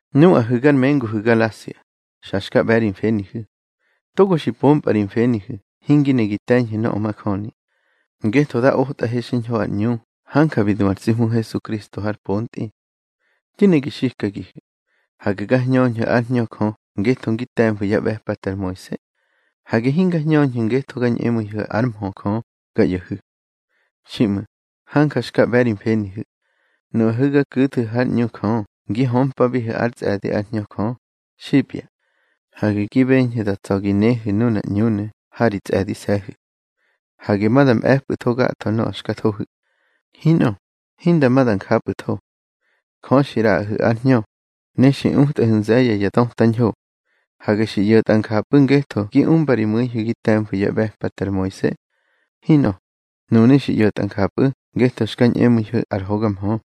Nuꞌahu̱ gar menguhu̱ Galasia, xa xka ꞌbe̱ ri mfenihu̱. Togo xi pompꞌa ri mfenihu̱ hingi ne gi te̱ñhu̱ nöꞌö majöni. Ngetho dá otꞌahe xiñho ar ꞌñu hanja bi du ar tsi Hmu Hesukristo har pontꞌi. Di ne gi xikagihu̱: Hage ga hñöñhu̱ ár Hñö Jö ngetho ngi te̱mfu̱ yá ꞌbe̱pate ar Moise. Hage hinga hñöñhu̱ ngetho ga ñꞌemu̱ibihu̱ ár mhö Jö ga ꞌyo̱hu̱. Xiꞌmu̱, hanja xka ꞌbe̱ ri mfenihu̱. Nuꞌahu̱ ga ku̱thu̱ hár ꞌñu Jö ngi hömpabihu̱ ár tsꞌe̱di ár Hñö Jö, xipya, hage gi beñhu̱ da tsa̱ gi nehu̱ nunar ꞌñunu̱ ha ri tsꞌe̱dise̱hu̱. Hage ma da mꞌe̱pꞌu̱tho gatho nöꞌö xka thohu̱. Hinꞌö, hinda ma da njapꞌu̱tho. Jö xi ꞌraꞌahu̱ ár Hñö, ne xi utꞌahu̱ nze̱ye̱ ya döta ñho. Hage xi ꞌyo̱tꞌa njapꞌu̱ ngetho gi umba ri mu̱ihu̱ gi te̱mfu̱ yá ꞌbe̱pate ar Moise. Hinꞌö. Nunu̱ xi ꞌyo̱tꞌa njapꞌu̱ ngetho xka ñꞌemu̱ihu̱ ar hoga mhö.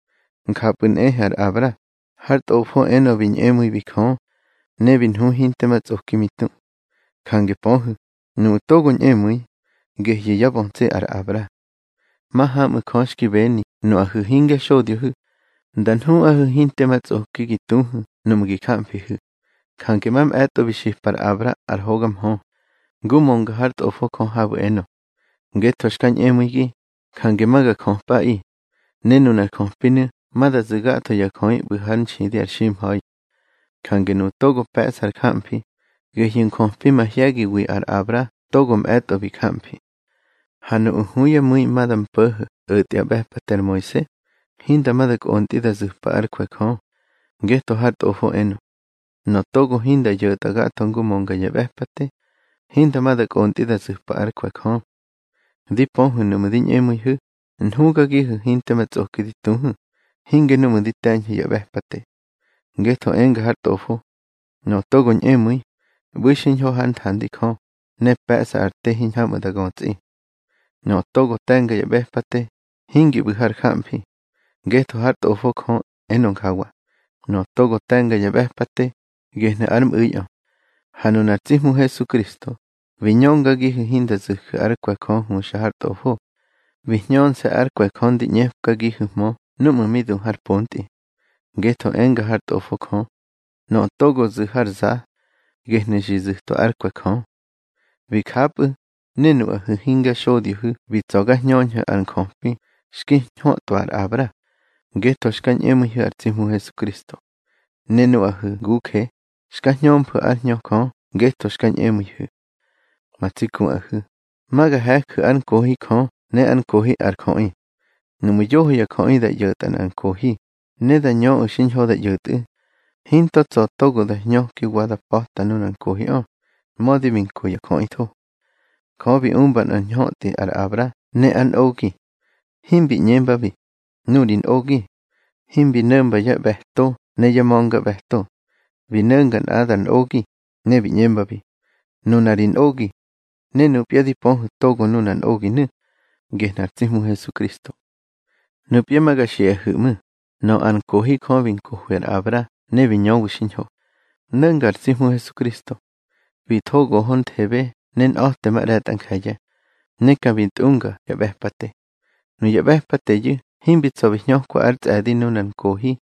Njapꞌu̱ nꞌehe ar Abra, har Tꞌofo enö bi ñꞌemu̱ibi Jö, ne bi nhu hinte ma tsꞌoki mi tu. Jange pöhu̱, nuꞌu̱ togo ñꞌemu̱i, gehyu̱ yá bötsi ar Abra. Mahaꞌmu̱ Jö xki beni, nuꞌahu̱ hingya xodyohu̱, nda nhuꞌahu̱ hinte ma tsꞌoki gi tuhu̱ nuꞌmu̱ gi jamfihu̱. Jange mamꞌe̱tꞌo bi xipa ar Abra ar hoga mhö, ngu mönga hár Tꞌofo Jö habu̱ enö: Ngetho xka ñꞌemu̱igi, jange ma ga jöpꞌaꞌi, ne nunar jöpinu̱ ma da zu̱ gatho ya jöꞌi ꞌbu̱ hár nxidi ar ximha̱i. Jange nuꞌu̱ togo pe̱ꞌsa ar jamfi, gehyu̱ njöpi mahye̱giwi ar Abra togo mꞌe̱tꞌo bi jamfi. Ha nuꞌu̱ hu yá mu̱i ma da mpo̱ho̱ o̱tꞌwa yá ꞌbe̱pate ar Moise, hinda ma da kꞌontꞌi da zu̱pa ár kwe̱ Jö. Ngetho har Tꞌofo enö: Nöꞌö togo hinda ꞌyo̱tꞌa gatho ngu mönga ya ꞌbe̱pate, hinda ma da kꞌontꞌi da zu̱pa ár kwe̱ Jö. Di pöhu̱ nuꞌmu̱ di ñꞌemu̱ihu̱, nhugagihu̱ hinte ma tsꞌoki di tuhu̱, hinge nuꞌmu̱ di te̱ñhu̱ ya ꞌbe̱pate. Ngetho enga har Tꞌofo: Nöꞌö togo ñꞌemu̱i, ꞌbu̱i xiñho hár nthandi Jö, ne pe̱ꞌsa ar te hiñhamꞌu̱ da götsꞌi. Nöꞌö togo te̱nga ya ꞌbe̱pate, hingi ꞌbu̱ har jamfi. Ngetho hár Tꞌofo Jö enö njawa: Nöꞌö togo te̱nga ya ꞌbe̱pate, gehnu̱ ár mꞌu̱iꞌö. Ha nunar tsi Hmu Hesukristo, bi ñöngagihu̱ hinda zu̱ju̱ ár kwe̱ Jö huxa har Tꞌofo. Bi hñönse̱ ár kwe̱ Jö ndi ꞌñepkagihu̱hmö núꞌmu̱ mi du har pontꞌi. Ngetho enga hár Tꞌofo Jö: Nöꞌö togo zu̱ har za, gehnu̱ xi zu̱twa ár kwe̱ Jö. Bi japꞌu̱, ne nuꞌahu̱ hingya xodyohu̱ bi tsa̱ ga hñöñhu̱ ar njöpi xki ñhötꞌwa ar Abra, ngetho xka ñꞌemu̱ihu̱ ar tsi Hmu Hesukristo. Ne nuꞌahu̱ nguje, xka hñömfu̱ ár Hñö Jö ngetho xka ñꞌemu̱ihu̱. Ma tsi kuꞌahu̱, ma ga he̱ju̱ ár nkohi Jö ne ár nkohi ar jöꞌi. Nuꞌmu̱ yoho ya jöꞌi da ꞌyo̱tꞌa nꞌar nkohi, ne da ñöꞌu̱ xiñho da ꞌyo̱tꞌu̱, hinto tsa̱ togo da hñöki wa da pa̱ta nuna nkohiꞌö, mödi bi nko ya jöꞌitho. Jö bi umba nꞌar ñhötꞌi ar Abra ne ár nꞌogi. Himbi ꞌñembabi: Nuꞌu̱ ri nꞌogi. Himbi no̱mba yá ꞌbe̱to ne yá ma̱ngaꞌbe̱to. Bi no̱nga nꞌadar nꞌogi, ne bi ꞌñembabi: Nuna ri nꞌogi. Ne nupya di pöhu̱ togo nunar nꞌoginu̱, gehnu̱ ar tsi Hmu Hesukristo. Nupya ma ga xiꞌahu̱ ꞌmu̱: Nöꞌö ar nkohi Jö bi nkohwi ar Abra ne bi ñöwi xiñho, no̱nga ar tsi Hmu Hesukristo. Bi tho gohonthebe ne nꞌa̱temaꞌre̱tꞌa nje̱ye̱, ne ka bi tꞌunga ya ꞌbe̱pate. Nuya ꞌbe̱pateyu̱ himbi tsa̱ bi hñökwa ár tsꞌe̱di nunar nkohi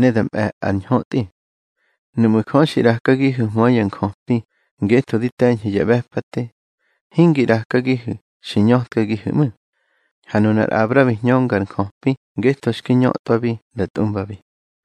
ne da mꞌe̱ ar ñhötꞌi. Nuꞌmu̱ Jö xi ꞌrakagihu̱hmö ya njöpi ngetho di te̱ñhu̱ ya ꞌbe̱pate, hingi ꞌrakagihu̱ xi ñötkagihu̱ ꞌmu̱. Ha nunar Abra bi hñönga ar njöpi ngetho xki ñhötwabi nda tꞌumbabi.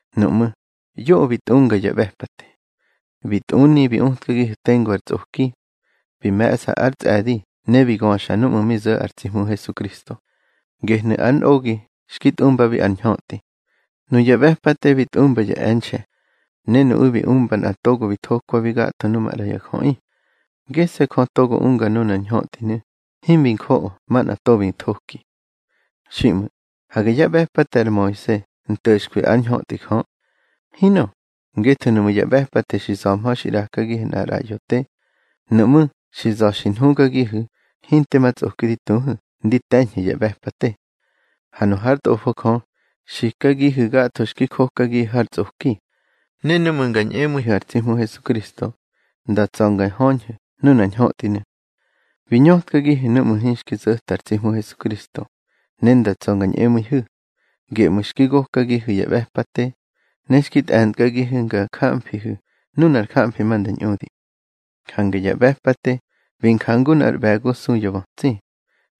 Nuꞌmú̱, yoꞌö bi tꞌunga ya ꞌbe̱pate. Bi tꞌuni bi utkagihu̱ tengu ar tsꞌoki. Bi me̱ꞌsa ár tsꞌe̱di ne bi göxa núꞌmu̱ mi zo̱ ar tsi Hmu Hesukristo, gehnu̱ ar nꞌogi xki tꞌumbabi ar ñhötꞌi. Nuya ꞌbe̱pate bi tꞌumba ya e̱nxe̱, ne nuꞌu̱ bi umba nꞌa togo bi thokwabi gatho nuꞌu̱ maꞌra ya jöꞌi. Gese̱ Jö togo unga nunar ñhötꞌinu̱, himi njoꞌo manꞌa to bi thoki. Xiꞌmu̱, hage yá ꞌbe̱pate ar Moise nto̱xkwi ár ñhötꞌi Jö. Hinꞌö. Ngetho nuꞌmu̱ ya ꞌbe̱pate xi za̱hmö xi ꞌrakagihu̱ nꞌar ꞌraꞌyo te, nuꞌmú̱ xi za̱ xi nhugagihu̱ hinte ma tsꞌoki di tuhu̱ ndi te̱ñhu̱ ya ꞌbe̱pate. Ha nu hár Tꞌofo Jö, xikagihu̱ gatho xki jokagihu̱ har tsꞌoki, ne nuꞌmu̱ nga ñꞌemu̱ihu̱ ar tsi Hmu Hesukristo, nda tsa̱ nga höñhu̱ nunar ñhötꞌinu̱. Bi ñötkagihu̱ núꞌmu̱ hinxki zo̱ta ar tsi Hmu Hesukristo ne nda tsa̱ nga ñꞌemu̱ihu̱. Geꞌmu̱ xki gokagihu̱ ya ꞌbe̱pate, ne xki tꞌe̱ntkagihu̱ nga jamfihu̱ nunar jamfi ma nda ñꞌudi. Jange ya ꞌbe̱pate bi njangu nꞌar ꞌbe̱go su ya bötsi.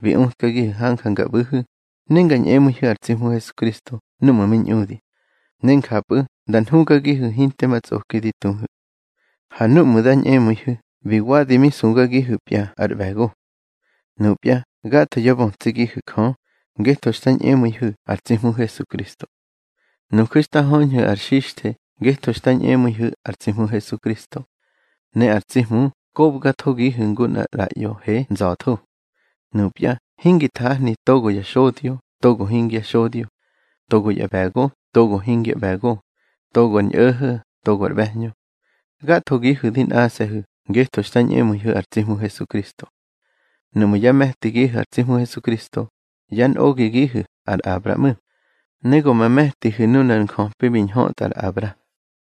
Bi utkagihu̱ hanja nga ꞌbu̱hu̱, ne nga ñꞌemu̱ihu̱ ar tsi Hmu Hesukristo núꞌmu̱ mi ñꞌudi. Ne njapꞌu̱ nda nhugagihu̱ hinte ma tsꞌoki di tuhu̱. Ha núꞌmu̱ dá ñꞌemu̱ihu̱, bi wadi mi sugagihu̱pya ar ꞌbe̱go. Nupya gatho yá bötsigihu̱ Jö, ngetho xta ñꞌemu̱ihu̱ ar tsi Hmu Hesukristo. Nuju̱ xta höñhu̱ ar xixthe ngetho xta ñꞌemu̱ihu̱ ar tsi Hmu Hesukristo. Ne ar tsi Hmu kobgathogihu̱ ngu nꞌar ꞌraꞌyo he nza̱tho. Nupya hingi nthahni togo ya xodyo togo hingya xodyo, togo ya ꞌbe̱go togo hingya ꞌbe̱go, togo ar ñꞌo̱ho̱ togo ar ꞌbe̱hñö. Gathogihu̱ di nꞌase̱hu̱ ngetho xta ñꞌemu̱ihu̱ ar tsi Hmu Hesukristo. Nuꞌmu̱ yá me̱tigihu̱ ar tsi Hmu Hesukristo, yá nꞌogigihu̱ ar Abra ꞌmu̱, ne go ma me̱tihu̱ nunar njöpi bi ñhötꞌa ar Abra.